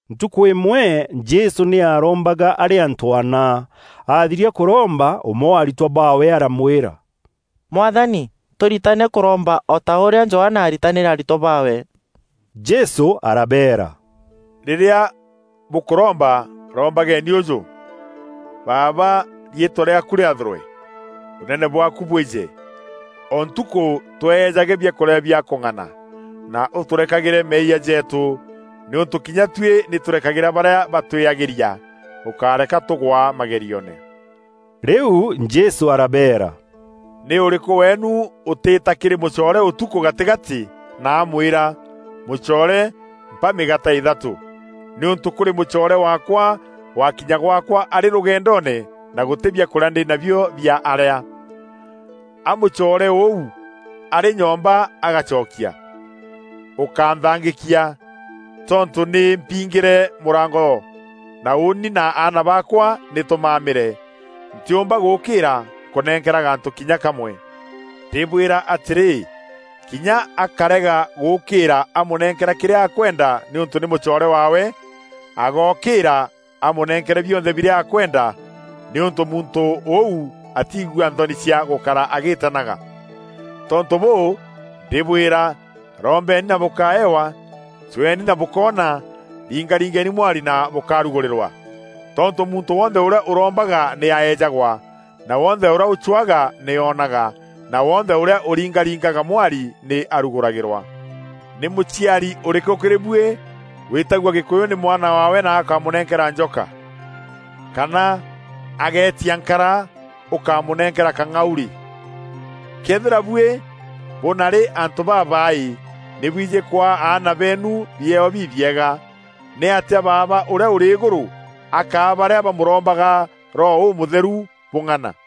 Ntukû îmwe Jesû nî aarombaga arî antû ana. Aathiria kûromba, ûmwe wa aritwa baawe aramwîra, “Mwathani, tûritane kûromba o ta ûrîa Johana aaritanîre aritwa baawe.” Jesû arabeera, “Rîrîa bûkûromba, rombageeni ûjû: Baaba, riîtwa rîaaku rîathûrwe; ûnene bwaaku bwîje. O ntukû tweejage biakûrîa bia kûng'ana; na ûtûrekagîre meeyia jeetû, nîûntû kinya tuî nî tûrekagîra barîa batwîagîria; ûkáreka tûgwa magerioone.” Rîu Jesû arabeera, “Nî ûrîkû weenû ûtîîta kîrî mûcoore ûtukû gatîgatî na amwîra, ‘Mûcoore, mpa mîgaate îthatû, nîûntû kûrî mûcoore waakwa waakinya gwaakwa arî rûgendoone na gûtî biakûrîa ndî nabio bia arîa.’ A mûcoore ûu arî nyomba agacokia, ‘Ûkánthangîkia! Tontû nî mpiingîre mûrango na ûûni na aana baakwa nî tûmamîre. Ntîûmba gûûkîra nkûnenkera gantû kinya kamwe!’ Ndîbwîra atîrî, kinya akarega gûûkîîra aamûnenkera kîrîa akwenda nîûntû nî mûcoore waawe, aagokîîra amûnenkere bionthe birîa akwenda, nîûntû muntû ûu atiigua nthoni cia gûkara agîîtanaga. Tontû bûû, ndîbwîra, rombeni na bûkaewa, cweeni na bûkoona, ringaringeni mwari na bûkarugûrîrwa. Tontû muntû wonthe ûrîa ûrombaga nî aejagwa, na wonthe ûrîa ûcwaga nî oonaga, na wonthe ûrîa ûringaringaga mwari nî arugûragîrwa. Nî mûciari ûrîkû kîrî buî wîîtagua gîkûyû nî mwana waawe na akamûnenkera njoka? Kana ageetia nkara ûkamûnenkera kang'aurî? Këethîra buî bûnari antû babaaî nî bwijî kwaa aana beenu biewa bibiega, nîatîa Baaba ûrîa ûrî îgûrû akaa barîa bamûrombaga Roho Ûmûtheru bûng'ana!”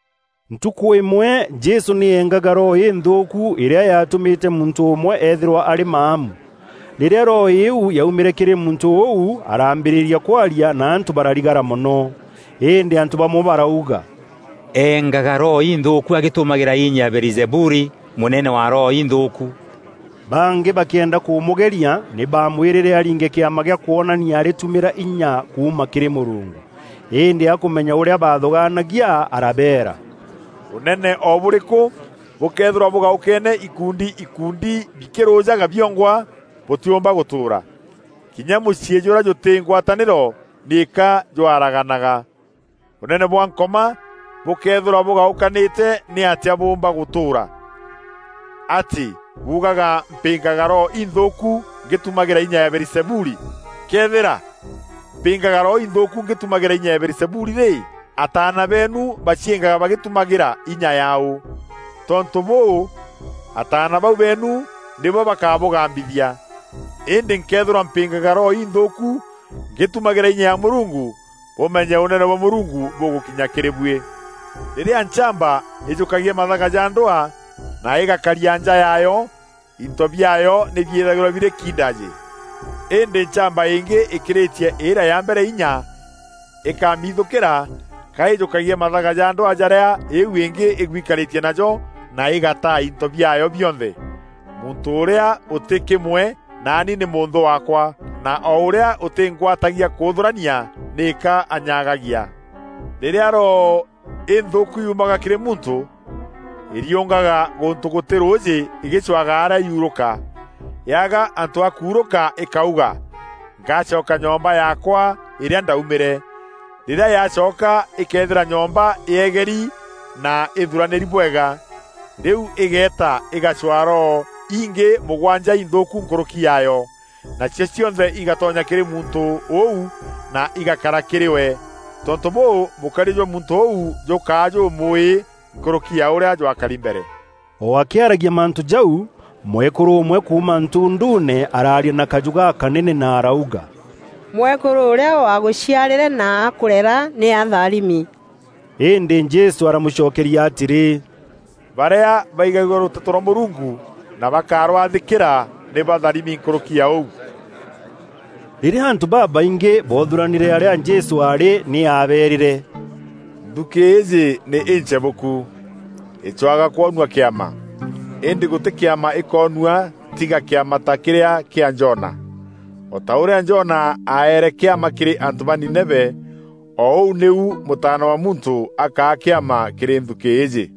Ntukû îmwe Jesû nî eengaga roho înthûûku îrîa yaatûmîte muntû ûmwe ethîrwa arî maamu. Rîrîa roho îîu yaumîre kîrî muntû ûu, araambîrîria kwaria na antû bararigara mono. Îndî antû bamwe barauga, “Engaga roho inthûûku agîtumagîra inya ya Beelizebuli, mûnene wa roho inthûûku.” Bangî bakîenda kûmûgeria, nî baamwîrîre aringe kîama gîa kwonania arîtumîra inya kuuma kîrî Mûrungu. Îndî akûmenya ûrîa baathûgaania arabeera, “Ûnene o bûrîkû bûkëethîrwa bûgaûkeene ikundi ikundi bikîrûjaga biongwa bûtîûmba gûtûûra. Kinya mûciî jûrîa jûtî ngwatanîro nîka jwaraganaga. Ûnene bwa Nkoma bûkëethîrwa bûgaûkanîte nîatîa bûûmba gûtûûra? Atî buugaga mpîngaga roho inthûûku ngîtumagîra inya ya Beelizebuli? Këethîra mpîngaga roho inthûûku ngîtumagîra inya ya Beelizebuli rî, ataana beenu baciîngaga bagîtumagîra inya yaaû? Tontû bûû, ataana bau beenu nîbo bakabûgambithia. Îndî nkëethîrwa mpîngaga roho inthûûku ngîtumagîra inya ya Mûrungu, bûmenye Ûnene bwa Mûrungu bûgûkinya kîrî buî. Rîrîa nchamba îjûkagia mathaga ja ndwaa na îgakaria nja yaayo, into biaayo nî biîthagîrwa birî kiindajî. Îndî nchamba îngî îkîrîtie îrîa ya mbere înya, îkamiithûkîra ka îjûkagia mathaga ja ndwaa jarîa îîu îngî îgwikarîtie najo na îgataa înto biaayo bionthe. Muntû ûrîa ûtî kîmwe naani nî mûnthû waakwa; na o ûrîa ûtîngwatagia kûûthûrania nîka anyagagia. “Rîrîa roho înthûûku yuumaga kîrî muntû, îriûngaga gûntû gûtî rûûjî îgîcwaga arîa yuurûka. Yaaga antû a kuurûka îkauga: ‘Ngacoka nyomba yaakwa îrîa ndaumîre.’ Rîrîa yacoka îkeethîra nyomba yeegeri na îthuranîri bwega. Rîu îgeeta îgacwaa roho ingî mûgwanja inthûûku nkûrûki yaayo, nacio cionthe igatonya kîrî muntû ûu na igakara kîrî we. Tontû bûû, mûkariî jwa muntû ûu jûkaa jûmûûî nkûrûki ya ûrîa jwakari mbere.” O akîaragia mantû jau, mwekûrû ûmwe kuuma ntunduune araaria na kajû gakanene na arauga, “Mwekûrû ûrîa waagûciarîre na akûrera nî atharimi.” Îndî Jesû aramûcokeria atîrî, “Barîa baigagua rûteto rwa Mûrungu na bakarwathîkîra nî batharimi nkûrûki ya ûu.” Rîrîa antû babaingî boothûûranîre arîa Jesû aarî nî aabeerîre, “Nthukî îîjî nî închebûku. Îcwaga kwonua kîama, îndî gûtî kîama îkoonua tiga kîama ta kîrîa kîa Jona. O ta ûrîa Jona aaere kîama kîrî antû ba Nineve, o ûu nîu Mûtaana wa Muntû akaa kîama kîrî nthukî îîjî.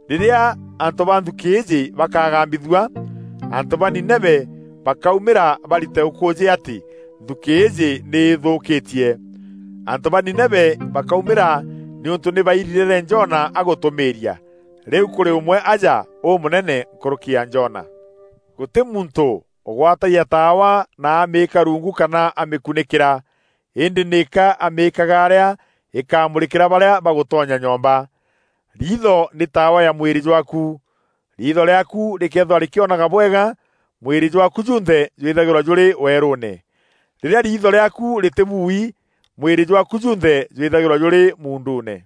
Rîrîa antû ba nthukî îîjî bakagambithua, antû ba Nineve bakaumîra barite ûkûûjî atî nthukî îîjî nî îthûûkîtie. Antû ba Nineve bakaumîra nîûntû nî baairirîre Jona agûtûmîîria. Rîu kûrî ûmwe aja ûmûnene nkûrûki ya Jona. “Gûtî muntû ûgwatagia taawa na amîîka rungu kana amîkunîkîra, îndî nîka amîîkaga arîa îkamûrîkîra barîa bagûtonya nyomba. Riitho nî taawa ya mwîrî jwaaku. Riitho rîaaku rîkeethîrwa rîkîonaga bwega, mwîrî jwaaku junthe jwîthagîrwa jûrî weerûûne. Rîrîa riitho rîaaku rîtîbui, mwîrî jwaaku junthe jwîthagîrwa jûrî muunduune.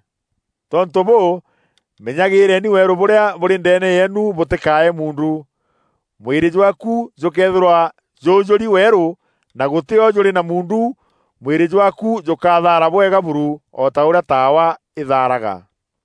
Tontû bûû, menyagîîreeni weerû bûrîa bûrî ndeene yeenu bûtîkae muundu. Mwîrî jwaaku jûkëethîrwa jûûjûûri weeru na gûtî o jûrî na muundu, mwîrî jwaaku jûkathaara bwega buru, o ta ûrîa taawa îthaaraga.”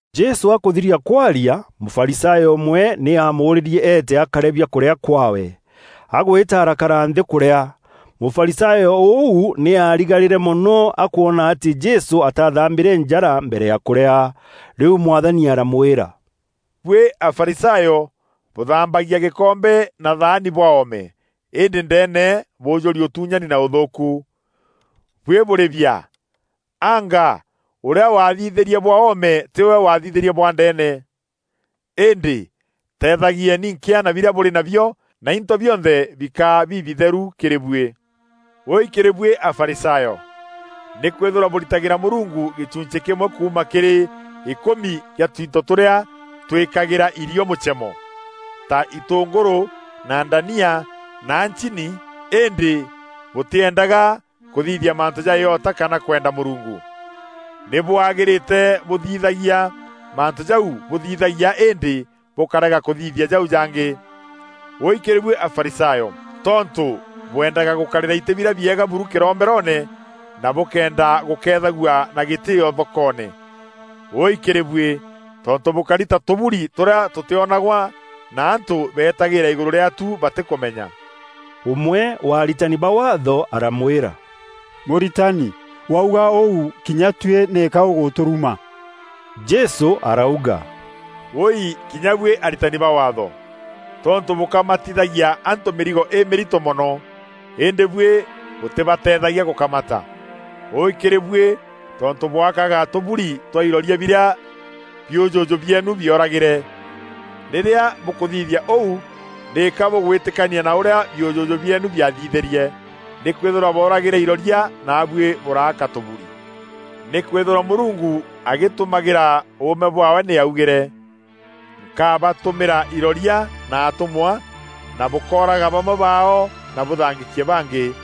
Jesû akûthiria kwaria, Mûfarisayo ûmwe nî aamûûrîrie eete akarîe biakûrîa kwaawe. Agwîta arakara nthî kûrîa. Mûfarisayo ûu nî aarigarîre mono akwona atî Jesû ataathambîre njara mbere ya kûrîa. Rîu Mwathani aramwîra, “Buî Afarisayo bûthambagia gîkombe na thaani bwa oome, îndî ndeene bûûjûrî ûtuunyani na ûthûûku. Buî bûrî biaa! Anga ûrîa wathithîrie bwa oome tîwe wathithîrie bwa ndeene? Îndî teethagieni nkîa na birîa bûrî nabio, na into bionthe bikaa bibitheru kîrî buî. “Wûûi kîrî buî Afarisayo! Nîkwîthîrwa bûritagîra Mûrungu gîchunchî kîmwe kuuma kîrî îkûmi kîa twinto tûrîa twîkagîra irîo mûchemo, ta itûngûrû na ndania na chini îndî bûtîendaga kûthithia mantû ja îota kana kwenda Mûrungu. Nî bwagîrîte bûthithagia mantû jau bûthithagia îndî bûkárega kûthithia jau jangî. Wûûi kîrî buî Afarisayo! Tontû bwendaga gûkarîra îtî birîa bieega buru kîromberoone na bûkeenda gûkeethagua na gîtîîo thokoone. Wûûi kîrî buî! Tontû bûkari ta tûburi tûrîa tûtîonagwa, na antû betagîîra îgûrû rîaatu batîkûmenya.” Ûmwe wa aritani ba Waatho aramwîra, “Mûritani, wauga ûu, kinya tuî nîka ûgûtûruma.” Jesû arauga, “Wûûi kinya buî aritani ba Waatho, tontû bûkamatithagia antû mîrigo îmîrito mono, îndî buî bûtîbateethagia gûkamata. Wûûi kîrî buî! Tontû bwakaga tûburi twa iroria birîa biûjûjû bieenu bioragîre. Rîrîa bûkûthithia ûu nîka bûgwîtikania na ûrîa biûjûjû bieenu biathithîrie. Nîkwîthîrwa booragîre iroria naabuî bûraaka tûburi. Nîkwîthîrwa Mûrungu agîtumagîra ûûme bwaawe nî augîre, ‘Nkabatûmîra iroria na atûmwa, na bûkooraga bamwe baao na bûthangîkie bangî.’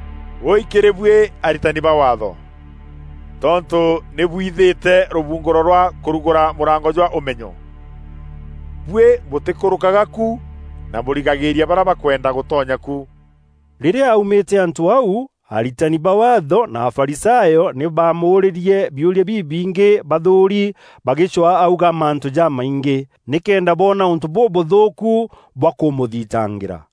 Wûûi kîrî buî aritani ba Waatho! Tontû nî bwithîte rûbungûro rwa kûrugûra mûrango jwa ûmenyo. Buî bûtîkûrûkaga ku, na bûrigagîîria barîa bakwenda gûtonya ku.” Rîrîa aumîte antû au, aritani ba Waatho na Afarisayo nî baamûûrîrie biûria bibingî bathûûri bagîcwaa auga mantû jamaingî, nîkenda boona ûntû bûbûthûûku bwa kûmûthitangîra.